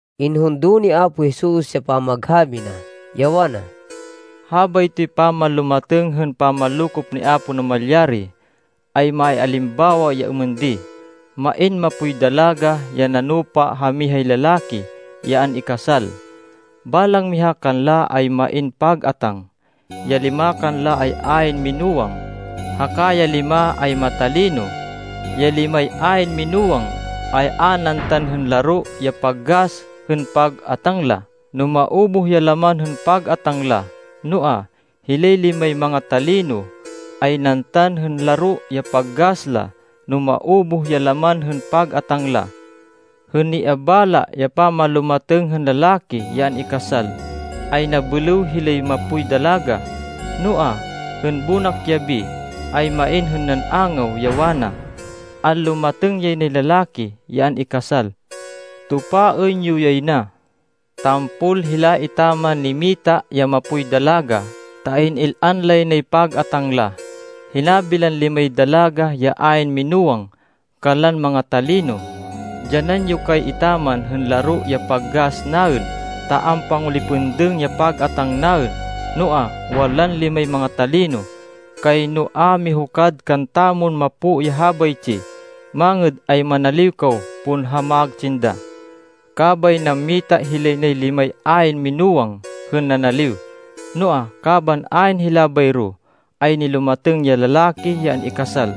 Inhundo ni Apo Jesus ya pamaghabi na, ya wana, “Habaytoy pamanlumatêng hên pamanlokop ni Apo Namalyari, ay maialimbawa ya êmên di: Main mapoy dalaga ya nanupa ha mihay lalaki ya an-ikasal. Balang miha kanla, ay main pag-atáng. Ya lima kanla ay ayn minúwang, haka ya lima ay matalino. Ya limay ayn minúwang, ay a nantan hên laro ya pag-gas hên pag-atáng la no maubuh ya laman hên pag-atáng la. Noa, hilay limay manga-talino, ay nantan hên laro ya pag-gas la no maubuh ya laman hên pag-atáng la. Hên niabala ya pamanlumatêng hên lalaki ya an-ikasal, ay nabêlêw hilay mapoy dalaga. “Noa, hên bonak yabi, ay main hên nan-angaw, ya wana, ‘Anlumatêng yay nay lalaki ya an-ikasal! Tupaên yo yay na!’ Tampol hila etaman nimata ya mapoy dalaga ta in-il-an lay nay pag-atáng la. Hinabi lan limay dalaga ya ayn minúwang kanlan manga-talino, ‘Dyanan yo kay etaman hên laro ya pag-gas naên ta ampangulipêndêng ya pag-atáng naên.’ Noa, wanlan limay manga-talino, ‘Kayno a mihukad kantamon mapo ya habaytsi. Mangêd ay manaliw kaw pon ha magtsinda.’ Kabay nammita hilay nay limay ayn minúwang hên nanaliw. Noa, kaban ayn hila bayro, ay nilumatêng ya lalaki ya an-ikasal.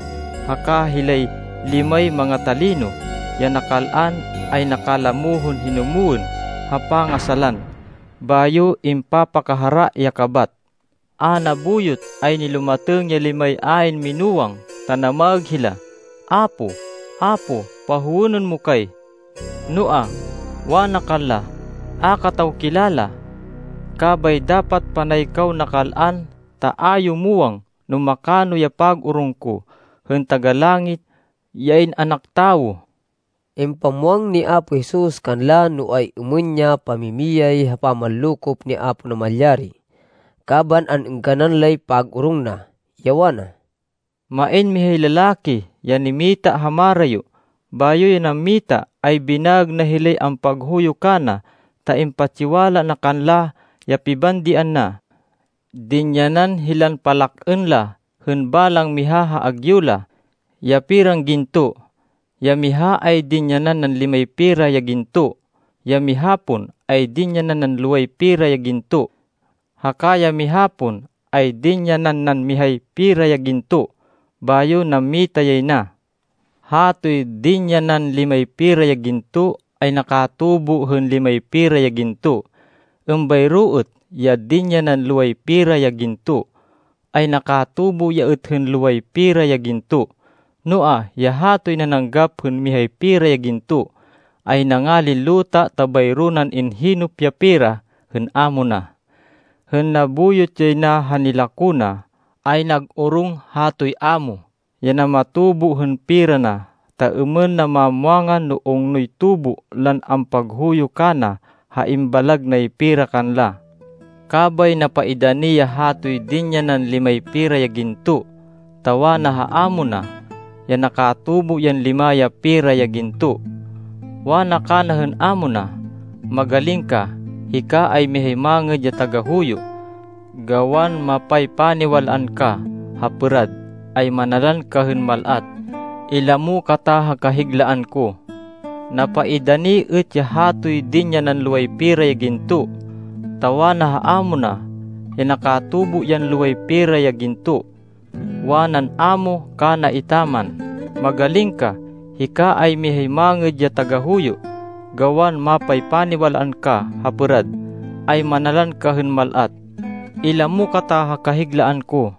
Haka hilay limay manga-talino ya nakal-an, ay nakalamo hên hinumwên ha pangasalan, bayo impapakahara ya kabat. “A nabuyot ay nilumatêng ya limay ayn minúwang ta namaêg hila, ‘Apo, Apo, pahowênên mo kay!’ Noa, wana kanla, ‘A kataw kilala!’ Kabay dapat panay kaw nakal-an, ta a yo muwang no makano ya pag-orong ko, hên Taga-Langit, ya In-anak Tawo.” Impamwang ni Apo Jesus kanla no ay-êmên ya pamimiyay ha pamanlokop ni Apo Namalyari kaban an-êngganan lay pag-orong na, ya wana, “Main mihay lalaki, ya mita ha marayo. Bayo ya nammita ay binaêg na hilay ampaghuyo kana ta impatsiwala na kanla ya pibandian na. Dinyanan hilan palak-ên la hên balang miha ha agyu la, ya peran ginto. Ya miha ay dinyanan nan limay pera ya ginto. Ya miha pon ay dinyanan nan loway pera ya ginto. Haka ya miha pon ay dinyanan nan mihay pera ya ginto. Bayo nammita yay na. Hatoy dinyanan limay pera ya ginto ay nakatubo hên limay pera ya ginto. Êmbayro êt ya dinyanan loway pera ya ginto ay nakatubo ya êt hên loway pera ya ginto. Noa, ya hatoy nananggap hên mihay pera ya ginto, ay nangalin luta ta bayro nan inhinêp ya pera hên amo na. “Hên nabuyot yay na ha nilako na, ay nag-orong hatoy amo ya namatubo hên pera na, ta êmên na mamwangan no ungnoy tubo lan ampaghuyo kana ha imbalag nay pera kanla. Kabay napaidani ya hatoy dinyanan limay pera ya ginto, ta wana ha amo na, ya nakatubo yan lima ya pera ya ginto. “Wana kana hên amo na, ‘Magaling ka! Hika ay mihay mangêd ya tagahuyo. Gawan mapaypaniwal-an ka ha pêrad, ay manalan ka hên mal-at. Ilamo kata ha kahiglaan ko.’ “Napaidani êt ya hatoy dinyanan loway pera ya ginto, ta wana ha amo na, ya nakatubo yan loway pera ya ginto. “Wanan amo kana etaman, ‘Magaling ka! Hika ay mihay mangêd ya tagahuyo. Gawan mapaypaniwal-an ka ha pêrad, ay manalan ka hên mal-at. Ilamo kata ha kahiglaan ko.’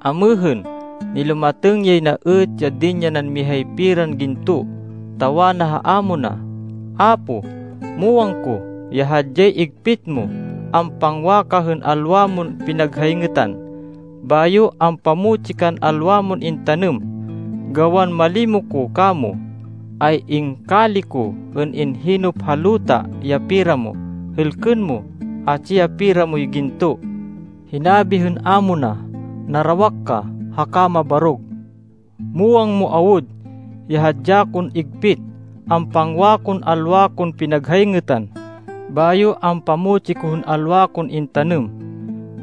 “Amêhên, nilumatêng yay na êt ya dinyanan mihay peran ginto, ta wana ha amo na, ‘Apo, muwang ko ya hadyay igpit mo. Ampangwa ka hên alwa mon pinaghayngêtan, bayo ampamutsi kan alwa mon intanêm. Gawan malimo ko kamo, ay ingkali ko hên inhinêp ha luta ya pera mo. Hêlkên mo, atsi ya pera moy ginto.’ “Hinabi hên amo na, ‘Narawak ka, haka nabarog! Muwang mo awud ya hadya kon igpit. Ampangwa kon alwa kon pinaghayngêtan, bayo ampamutsi ko hên alwa kon intanêm!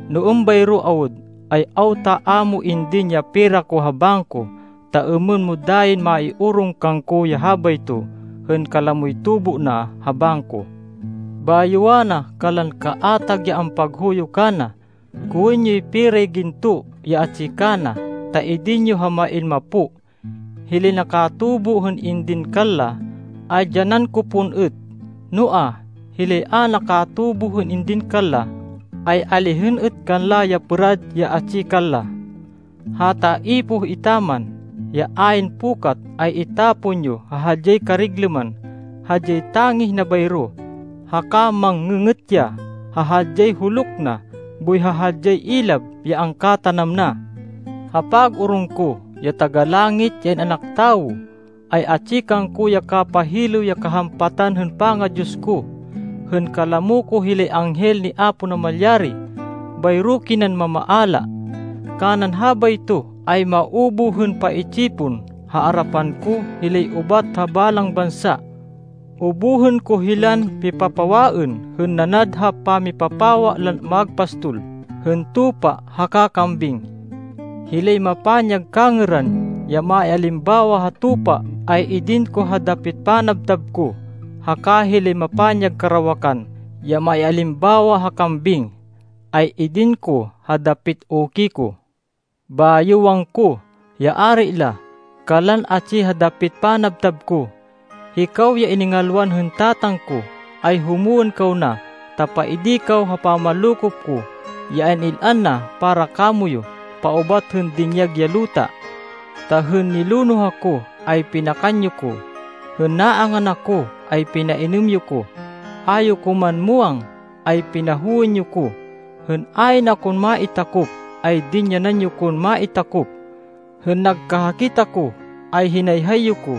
No êmbayro awud, ay awta a mo indin ya pera ko ha bangko, ta êmên mo dayin maiorong kangko ya habayto hên kalamoy tubo na ha bangko!’ Bayo wana kanlan kaatag ya ampaghuyo kana, ‘Kowên yoy peray ginto, ya atsi kana, ta idin yo ha main mapo. Hilay nakatubo hên indin kanla, ay dyanan ko pon êt. Noa, hilay a nakatubo hên indin kanla, ay alihên êt kanla ya pêrad ya atsi kanla. Hata ipoh etaman, ya ayn pukat, ay itapon yo ha hadyay kariglêman. Hadyay tangih na bayro, haka mang-ngê-ngêt ya ha hadyay huluk na boy ha hadyay ilab ya angkatanam na.’” “Ha pag-orong ko, ya Taga-Langit, ya In-anak Tawo, ay atsi kangko ya kapahilêw ya kahampatan hên panga-Diyos ko, hên kalamo ko hilay anghel ni Apo Namalyari. Bayro kinan mamaala. Kanan habayto ay maubuh hên paitsipon ha arapan ko hilay ubat ha balang bansa. Ubuhên ko hilan pipapawaên hên nanad ha pamipapawa lan magpastol hên tupa haka kambing. Hilay mapanyag kangêran, ya maialimbawa ha tupa ay idin ko ha dapit panabtab ko, haka hilay mapanyag karawakan ya maialimbawa ha kambing, ay idin ko ha dapit uki ko. Bayo wangko, ya Ari la, kanlan atsi ha dapit panabtab ko, ‘Hikaw ya iningalwan hên Tatang ko, ay humwên kaw na, ta paidi kaw ha pamanlokop ko, ya in-il-an na para kamoyu paubat hên dinyag ya luta. Ta hên nilonoh ako, ay pinakan yo ko. Hên naangan ako, ay pinainêm yo ko. A yo ko man muwang, ay pinahowên yo ko. Hên ayn akon maitakop, ay dinyanan yo kon maitakop. Hên nagkahakit ako, ay hinayhay yo ko.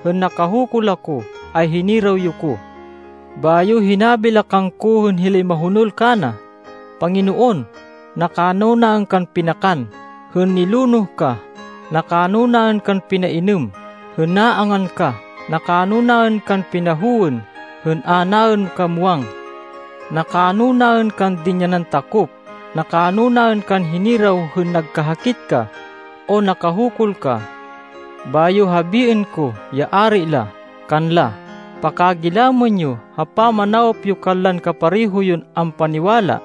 Hên nakahukul ako, ay hiniraw yo ko.’ “Bayo hinabi la kangko hên hilay mahonol kana, ‘Panginoon, nakano naên kan pinakan hên nilonoh ka? Nakano naên kan pinainêm hên naangan ka? Nakano naên kan pinahowên hên a naên ka muwang? Nakano naên kan dinyanan takop? Nakano naên kan hiniraw hên nagkahakit ka, o nakahukul ka?’ “Bayo habiên ko, ya ari la, kanla, ‘Pakagilamên yo, ha pamanawop yo kanlan kapareho yon ampaniwala,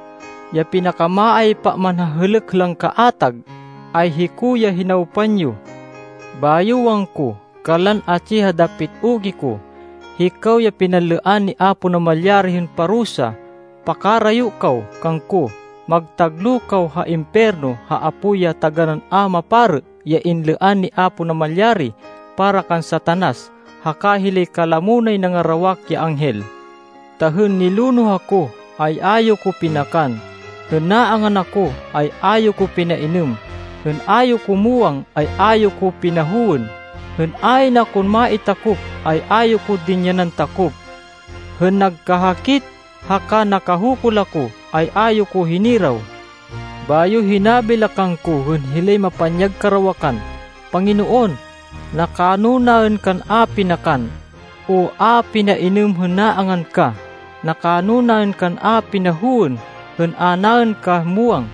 ya pinakamaaypa man ha hêlêk lan kaatag, ay hiko ya hinawpan yo.’ “Bayo wangko, kanlan atsi ha dapit uki ko, ‘Hikaw ya pinanlêan ni Apo Namalyari hên parusa, pakarayo kaw kangko, magtagloh kaw ha impiyerno ha apoy ya taganán a maparê ya inlêan ni Apo Namalyari para kan Satanas haka hilay kalamo nay nangarawak ya anghel. Ta hên nilonoh ako, ay a yo ko pinakan. Hên naangan ako, ay a yo ko pinainêm. Hên a yo ko muwang, ay a yo ko pinahowên. Hên ayn akon maitakop, ay a yo ko dinyanan takop. Hên nagkahakit, haka nakahukul ako, ay a yo ko hiniraw.’ Bayo hinabi la kangko hên hilay mapanyag karawakan, ‘Panginoon, nakano naên kan a pinakan, o a pinainêm hên naangan ka? Nakano naên kan a pinahowên hên a naên ka muwang?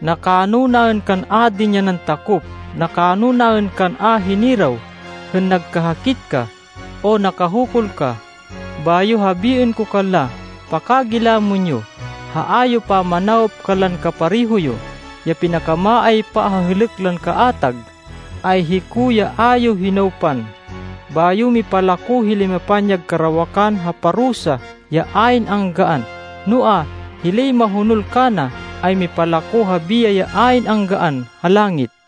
Nakano naên kan a dinyanan takop? Nakano naên kan a hiniraw hên nagkahakit ka, o nakahukul ka?’ Bayo habiên ko kanla, ‘Pakagilamên yo, ha a yo pamanawop kanlan kapareho yo, ya pinakamaaypa ha hêlêk lan kaatag, ay hiko ya a yo hinawpan.’ Bayo mipalako hilay mapanyag karawakan ha parusa ya ayn anggaan, noa, hilay mahonol kana, ay mipalako ha biyay ya ayn anggaan ha langit.”